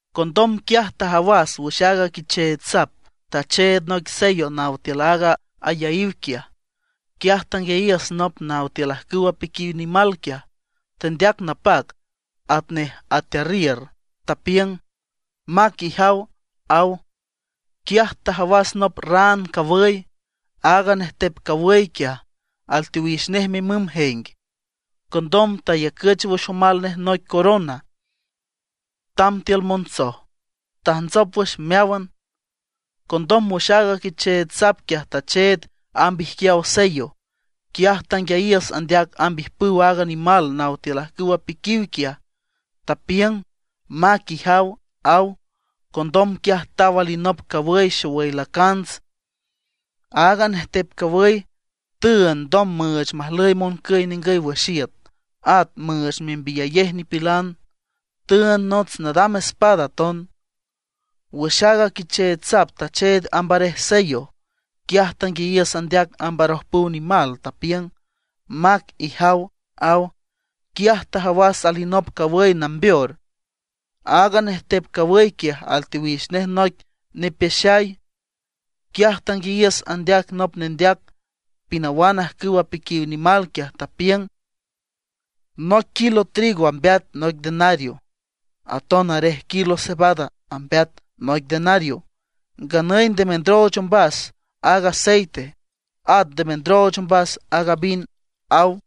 Condom quiaj tajawas wüx aaga Quicheech Sap tacheed noic sello naw tiül aaga ayaíw quiaj. Quiaj tanguiayiüs nop naw tiül ajcüw apiquiw nimal quiaj tendeac napac atnej atearriür, tapiüng: ―¡Mac, ijaw! ―aw. Quiaj tajawas nop raan cawüy. Aaga nejtep cawüy quiaj alteowix nej mimüm jeng. Condom tayacüch wüx omal nej noic corona, tamb tiül montsoj, tajntsop wüx meáwan. Condom wüx aaga Quicheech Sap quiaj tacheed amb ijquiaw sello, quiaj tanguiayiüs andeac amb ijpüw aaga nimal naw tiül ajcüw apiquiw quiaj, tapiüng: ―¡Mac, ijaw! ―aw. Condom quiaj taw alinop cawüy xowüy lacants. Aaga nejtep cawüy tüünd ndom müüch majlüy moncüy ningüy wüx iüt, at müüch membiyayej nipilan. Tüünd nots nadam espada aton. Wüx aaga Quicheech Sap tacheed amb arej sello, quiaj tanguiayiüs andeac amb arojpüw nimal, tapiüng: ―¡Mac, ijaw! ―aw. Quiaj tajawas alinop cawüy nambeor. Aaga nejtep cawüy quiaj alteowix nej noic nipeaxay. Quiaj tanguiayiüs andeac nop nendeac pinawan ajcüw apiquiw nimal quiaj, tapiüng: ―Noic kilo trigo ambeat noic denario, aton arej kilo cebada ambeat noic denario. Nganüy nde mendrooch ombas aaga aceite, at nde mendrooch ombas aaga vin ―aw.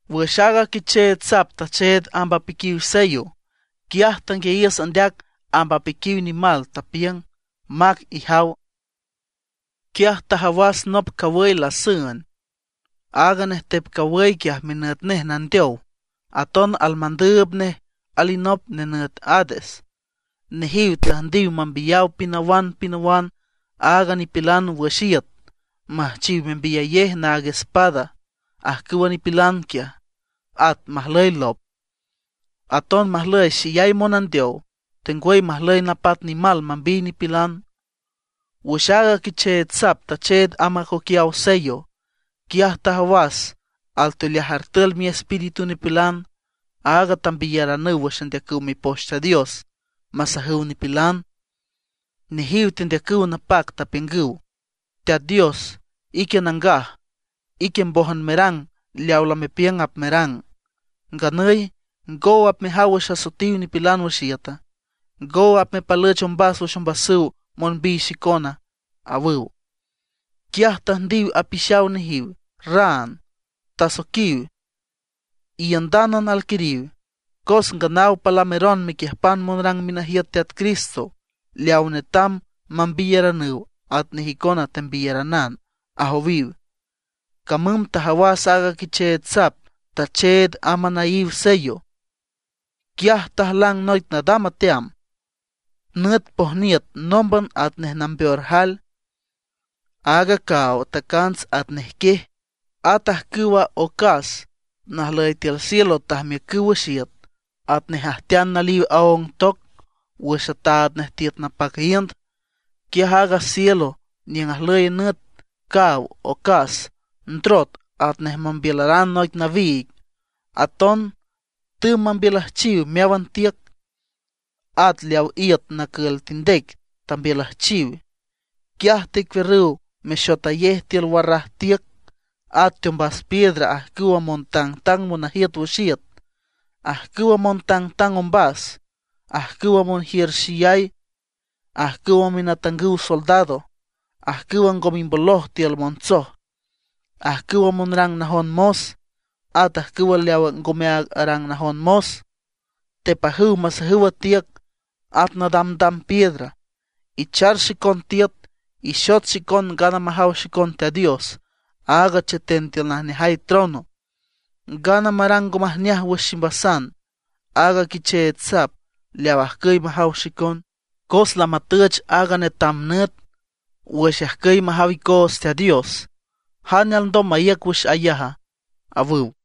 Wüx aaga Quicheech Sap tacheed amb apiquiw sello, quiaj tanguiayiüs andeac amb apiquiw nimal, tapiüng: ―¡Mac, ijaw! ―aw. Quiaj tajawas nop cawüy lasüen. Aaga nejtep cawüy quiaj minüt nej Nandeow. Aton almandüüb nej alinop nenüt Hades. Nejiw tüjndiw mambiyaw pinawan pinawan aaga nipilan wüx iüt; müjchiw membiyayej naag espada ajcüwa nipilan quiaj, at majlüy lop, aton majlüy xeyay monandeow, tengwüy majlüy napat nimal mambiy nipilan. Wüx aaga Quicheech Sap tacheed amb acoquiaw sello, quiaj tajawas alteoleaj artül miespíritu nipilan, aag tambiyaranüw wüx andeacüw Mipoch Teat Dios masajüw nipilan. Nejiw tendeacüw napac, tapiüngüw: ―Teat Dios, ique nangaj, ique mbójan merang leaw lamepiüng apmerang. Nganüy ¿ngow apmejaw wüx asoetiw nipilan wüx iüta? ¿Ngow apmepalüch ombas wüx ombasüw monbiy xicona? ―awüw. Quiaj tüjndiw apixaw nejiw raan, tasoiquiw: ―Iiündánan alquiriw, cos nganaw palameron mequiüjpan monrang minajiüt Teat Cristo leaw netam mambiyeranüw atnej icona tembiyeranan ―ajowiw. Camüm tajawas aaga Quicheech Sap tacheed amb anaíw sello. Quiaj tajlang noic nadam ateam, nüt pojniüt nómban atnej nambeor jael. At a caaw tacants atnej quiej. At ajcüwa ocas najlüy tiül cielo tajmiücüw wüx iüt atnej ajtean naliw aóng toc wüx ataad nej tiüt napac iünd. Quiaj aaga cielo niüng ajlüy nüt, caaw, ocas, ndrot atnej mambiülaran noic nawiig. Aton tümb mambiülüjchiw meáwan tiüc; at leaw iüt nacül tindec tambiülüjchiw. Quiaj tecuiürrüw mexotayej tiül warraj tiüc, at teombas piedra ajcüwa montangtang monajiüt wüx iüt, ajcüwa montangtang ombas, ajcüwa monjiür xeyay, ajcüwa minatangüw soldado, ajcüwa ngo mimboloj tiül montsoj, ajcüwa monrang najon mos, at ajcüw leaw ngome aag arang najon mos; tepajüw masajüw a tiüc, at nadamdam piedra: ―Ichar xicon tiüt, ixot xicon ngana majaw xicon Teat Dios, áag cheten tiül najneajay trono, ngana marang ngo majneaj wüx ximbasan aaga Quicheech Sap leaw ajcüy majaw xicon; cos lamatüch aaga netam nüt wüx ajcüy majaw icoots Teat Dios. ¿Jane alndom maíüc wüx ayaj? ―awüw.